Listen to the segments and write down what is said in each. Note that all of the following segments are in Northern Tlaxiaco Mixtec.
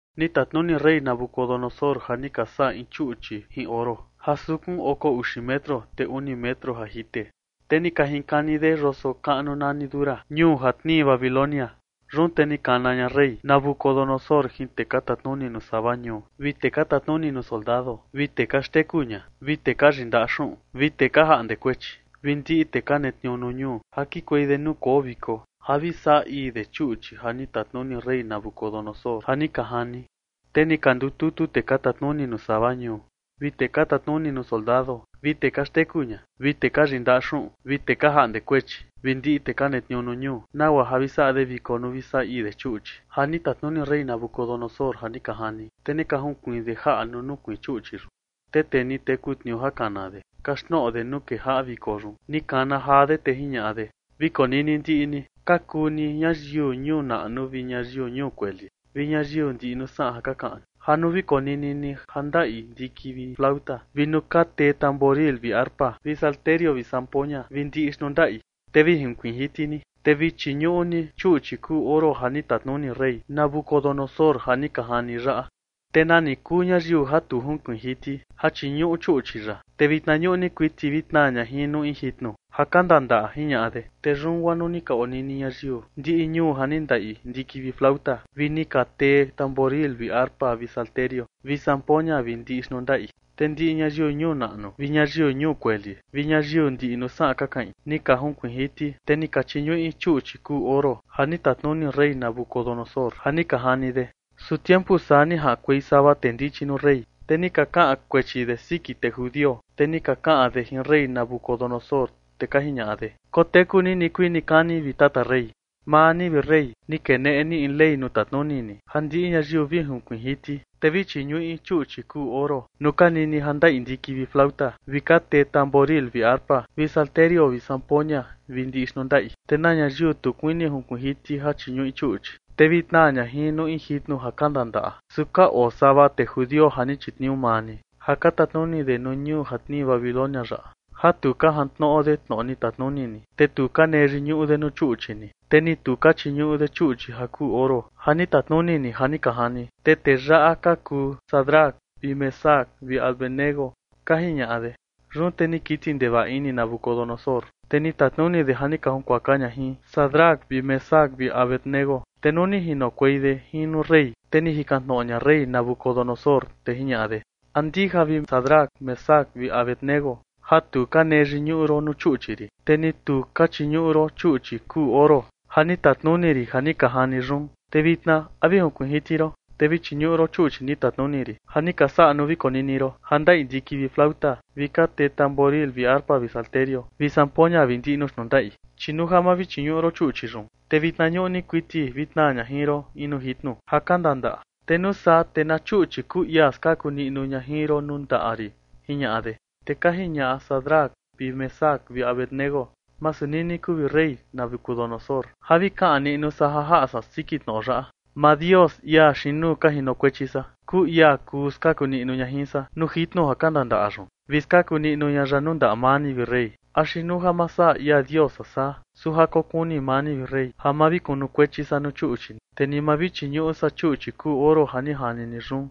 Ni tatnuni rey Nabucodonosor ja ni ka saꞌa in chuꞌchi jin oro, ja sukun oko uxi metro, te uni metro ja jite, te ni ka jinkani de yoso kaꞌnu nani Dura, ñuu ja tnii Babilonia. Yun te ni kana ña rey Nabucodonosor jin tee ka tatnuni nuu sava ñuu, vi tee ka tatnuni nuu soldado, vi tee ka xteku ña, vi tee ka yindaꞌa xuꞌun, vi tee ka jaꞌnde kuechi, vi ndiꞌi tee ka netniuu nuu ñuu ja kikuei de nuu koo viko ja vi saꞌa ii de chuꞌchi ja ni tatnuni rey Nabucodonosor ja ni ka jani. Te ni ka ndututu tee ka tatnuni nuu sava ñuu, vi tee ka tatnuni nuu soldado, vi tee ka xteku ña, vi tee ka yindaꞌa xuꞌun, vi tee ka jaꞌnde kuechi, vi ndiꞌi tee ka netniuu nuu ñuu, nagua ja vi saꞌa de viko nuu vi saꞌa ii de chuꞌchi ja ni tatnuni rey Nabucodonosor ja ni ka jani. Te ni ka junkuiin de jaꞌa nuu nukuiin chuꞌchi yun. Te tee ni teku tniuu ja kana de kaxtnoꞌo de nuu kejaꞌa viko yun, ni kana jaa de, te jiñaꞌa de: ―Vi konini ndiꞌi ni, ka kuu ni ñayiu ñuu naꞌnu vi ñayiu ñuu kueli vi ñayiu ndiꞌi nuu saꞌan ja ka kaꞌan ni, ja nuu vi konini ni ja ndaꞌi ndiki vi tnuyoo, vi nuu ka tee tamboril vi arpa vi salterio vi zampoña vi ndiꞌi xnuu ndaꞌi, te vi jinkuiin jiti ni, te vi chiñuꞌu ni chuꞌchi kuu oro ja ni tatnuni rey Nabucodonosor ja ni ka jani yaꞌa. Te nani kuu ñayiu ja tu junkuiin jiti ja chiñuꞌu chuꞌchi yaꞌa, te vi vitna ñuꞌni kuiti vi tnaa ña jin nuu in jitnu ja kandandaꞌa ―jiñaꞌa de. Te yun guaa nuu ni ka onini ñayiu ndiꞌi ñuu ja ni ndaꞌi ndiki vi tnuyoo, vi ni ka tee tamboril vi arpa vi salterio vi zampoña vi ndiꞌi xnuu ndaꞌi, te ndiꞌi ñayiu ñuu naꞌnu vi ñayiu ñuu kueli vi ñayiu ndiꞌi nuu saꞌan ka kaꞌin, ni ka junkuiin jiti, te ni ka chiñuꞌi chuꞌchi kuu oro, ja ni tatnuni rey Nabucodonosor ja ni ka jani de. Su tiempu saa, ni jaꞌankuei sava tee ndichi nuu rey, te ni ka kaꞌan kuechi de siki tee judio. Te ni ka kaꞌan de jin rey Nabucodonosor, te ka jiñaꞌa de: ―Koteku ni nikuii nikani, vi tata rey. Maa ni, vi rey, ni keneꞌe ni in ley nuu tatnuni ni ja ndiꞌi ñayiu vi junkuiin jiti, te vi chiñuꞌi chuꞌchi kuu oro nuu ka nini ja ndaꞌi ndiki vi tnuyoo, vi ka tee tamboril vi arpa vi salterio vi zampoña, vi ndiꞌi xnuu ndaꞌi. Te na ñayiu tu kuini junkuiin jiti ja chiñuꞌi chuꞌchi, te vi tnaa ña jin nuu in jitnu ja kandandaꞌa. Su ka oo sava tee judio ja ni chitniuu maa ni ja ka tatnuni de nuu ñuu ja tnii Babilonia yaꞌa, ja tu ka jantnoꞌo de tnoꞌo ni tatnuni ni. Te tu ka nee yiñuꞌu de nuu chuꞌchi ni, te ni tu ka chiñuꞌu de chuꞌchi ja kuu oro ja ni tatnuni ni ja ni ka jani. Te tee yaꞌa ka kuu Sadrac vi Mesac vi Abed-nego ―ka jiñaꞌa de. Yun te ni kiti ndevaꞌa ini Nabucodonosor, te ni tatnuni de ja ni ka junkuaka ña jin Sadrac vi Mesac vi Abed-nego. Te nuu ni jinokuei de jin nuu rey, te ni jikan tnoꞌo ña rey Nabucodonosor, te jiñaꞌa de: ―¿A ndija, vi Sadrac, Mesac vi Abed-nego, ja tu ka nee yiñuꞌu ron nuu chuꞌchi rin, te ni tu ka chiñuꞌu ron chuꞌchi kuu oro ja ni tatnuni rin ja ni ka jani yun? Te vitna, ¿a vi junkuiin jiti ron, te vi chiñuꞌu ron chuꞌchi ni tatnuni rin ja ni ka saꞌa nuu vi konini ron ja ndaꞌi ndiki vi tnuyoo, vi ka tee tamboril vi arpa vi salterio vi zampoña vi ndiꞌi nuu xnuu ndaꞌi? Chi nuu ja ma vi chiñuꞌu ron chuꞌchi yun, te vitna ñuꞌni kuiti vi tnaa ña jin ron in nuu jitnu ja kandandaꞌa. Te nuu saa, ¿te na chuꞌchi kuu ia skaku niꞌnu ña jin ron nuu ndaꞌa rin? ―jiñaꞌa de. Te ka jiñaꞌa Sadrac vi Mesac vi Abed-nego: ―Masu nini kuu, vi rey Nabucodonosor, ja vi kaꞌan niꞌnu san ja jaꞌa san siki tnoꞌo yaꞌa. Maa Dios, ia xiin nuu ka jinokuechi san, kuu ia kuu skaku niꞌnu ña jin san nuu jitnu ja kandandaꞌa yun, vi skaku niꞌnu ña ya nuu ndaꞌa maa ni, vi rey. Axi nuu ja ma saꞌa ia Dios san saa, su ja kokuni maa ni, vi rey, ja ma vi kunukuechi san nuu chuꞌchi ni, te ni ma vi chiñuꞌu san chuꞌchi kuu oro ja ni jani ni yun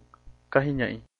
―ka jiñaꞌi.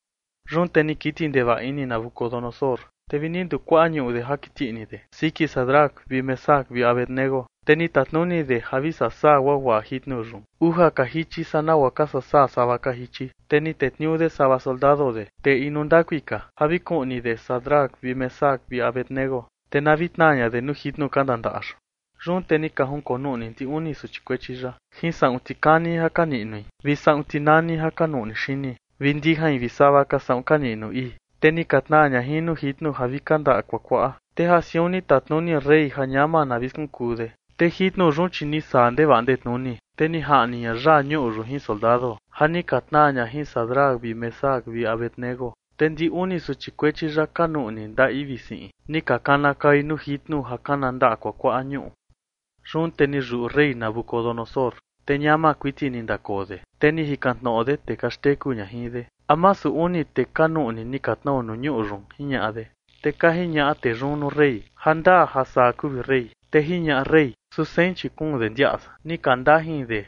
Yun te ni kiti ndevaꞌa ini Nabucodonosor, te vi ni ndukuaꞌa ñuꞌu de ja kiti ini de siki Sadrac vi Mesac vi Abed-nego. Te ni tatnuni de ja vi sasaa guaguaꞌa jitnu yun uja ka jichi saa nagua ka sasaa sava ka jichi. Te ni tetniuu de sava soldado de, tee inu ndakui ka, ja vi kuꞌni de Sadrac vi Mesac vi Abed-nego, te na vi tnaa ña de nuu jitnu kandandaꞌa yun. Yun te ni ka jinkonuꞌni ndi uni suchi kuechi yaꞌa jin saꞌun tikani ja ka niꞌnui vi saꞌun tinani ja ka nuꞌni xini, vi ndijain, vi sava ka saꞌun ka niꞌnu ii, te ni ka tnaa ña jin nuu jitnu ja vi kandaꞌa kuakuaꞌa. Te ja siun ni tatnuni rey ja ñama na vi skunkuu de, te jitnu yun, chi ni saa ndevaꞌa ndetnuni, te ni jaꞌni ña yaa ñuꞌu yun jin soldado ja ni ka tnaa ña jin Sadrac vi Mesac vi Abed-nego. Te ndi uni suchi kuechi yaꞌa ka nuꞌni ndaꞌi vi siꞌin, ni ka kanakaui nuu jitnu ja kandaꞌa kuakuaꞌa ñuꞌu. Yun te ni yuꞌu rey Nabucodonosor, te ñama kuiti ni ndakoo de, te ni jikan tnoꞌo de tee ka xteku ña jin de: ―¿A masu uni tee ka nuꞌni ni ka tnao nuu ñuꞌu yun? ―jiñaꞌa de. Te ka jiñaꞌa tee yun nuu rey: ―Jandaa ja saa kuu, vi rey. Te jiñaꞌa rey: ―Su sein, chi kuun de ndiaꞌa san ni ka ndajin de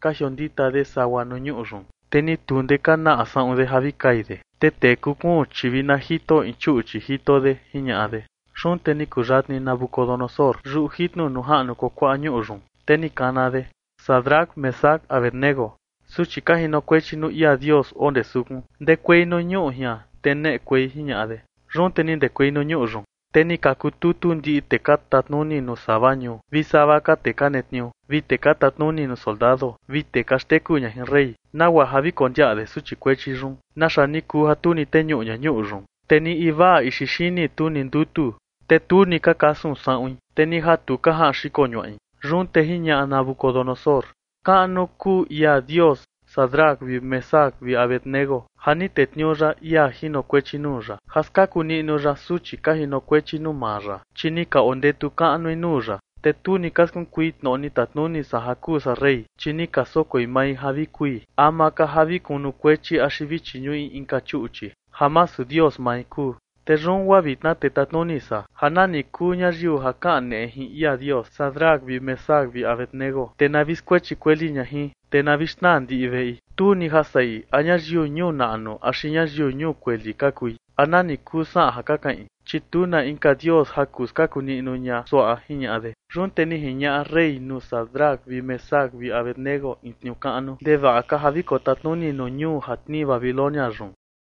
ka jiondita de sagua nuu ñuꞌu yun. Te ni tu ndee ka naꞌa saꞌun de ja vi kai de, te tee kuu kuun, chi vi na jito in chuꞌchi jito de ―jiñaꞌa de. Yun te ni kuyatni Nabucodonosor yuꞌu jitnu nuu jaꞌnu kuakuaꞌa ñuꞌu yun, te ni kana de: ―Sadrac, Mesac, Abed-nego, suchi ka jinokuechi nuu ia Dios oo ndee sukun, ndekuei nuu ñuꞌu jian, te neꞌekuei ―jiñaꞌa de. Yun te ni ndekuei nuu ñuꞌu yun. Te ni ka kututu ndiꞌi tee ka tatnuni nuu sava ñuu, vi sava ka tee ka netniuu, vi tee ka tatnuni nuu soldado, vi tee ka xteku ña jin rey, nagua ja vi kondiaꞌa de suchi kuechi yun, naxa ni kuu ja tu ni teñuꞌu ña ñuꞌu yun. Te ni invaa ixi xini, tu ni ndutu, te ni tu ni ka kasun saꞌuin, te ni ja tu ka jaꞌan xiko ñuaꞌin. Yun te jiñaꞌa Nabucodonosor: ―Kaꞌnu kuu ia Dios Sadrac vi Mesac vi Abed-nego ja ni tetniuu ya ia jinokuechi nuu ya ja skaku niꞌnu ya suchi ka jinokuechi nuu maa ya. Chi ni ka ondetu kaꞌnui nuu ya, te tu ni ka skunkui tnoꞌo ni tatnuni san ja kuu san rey, chi ni ka sokoi mai ja vi kui ama ka ja vi kunukuechi axi vi chiñuꞌi inka chuꞌchi ja masu Dios mai kuu. Te yun guaa vitna, te tatnuni san ja nani kuu ñayiu ja kaneꞌe jin ia Dios Sadrac vi Mesac vi Abed-nego, te na vi skuechi kueli ña jin, te na vi xnaa ndiꞌi veꞌi, tu ni ja saꞌi a ñayiu ñuu naꞌnu axi ñayiu ñuu kueli ka kui, a nani kuu saꞌan ja ka kaꞌin, chi tu na inka Dios ja kuu skaku niꞌnu ña suaꞌa ―jiñaꞌa de. Yun te ni jiñaꞌa rey nuu Sadrac vi Mesac vi Abed-nego in tniuu kaꞌnu ndevaꞌa ka ja vi kotatnuni nuu ñuu ja tnii Babilonia yun.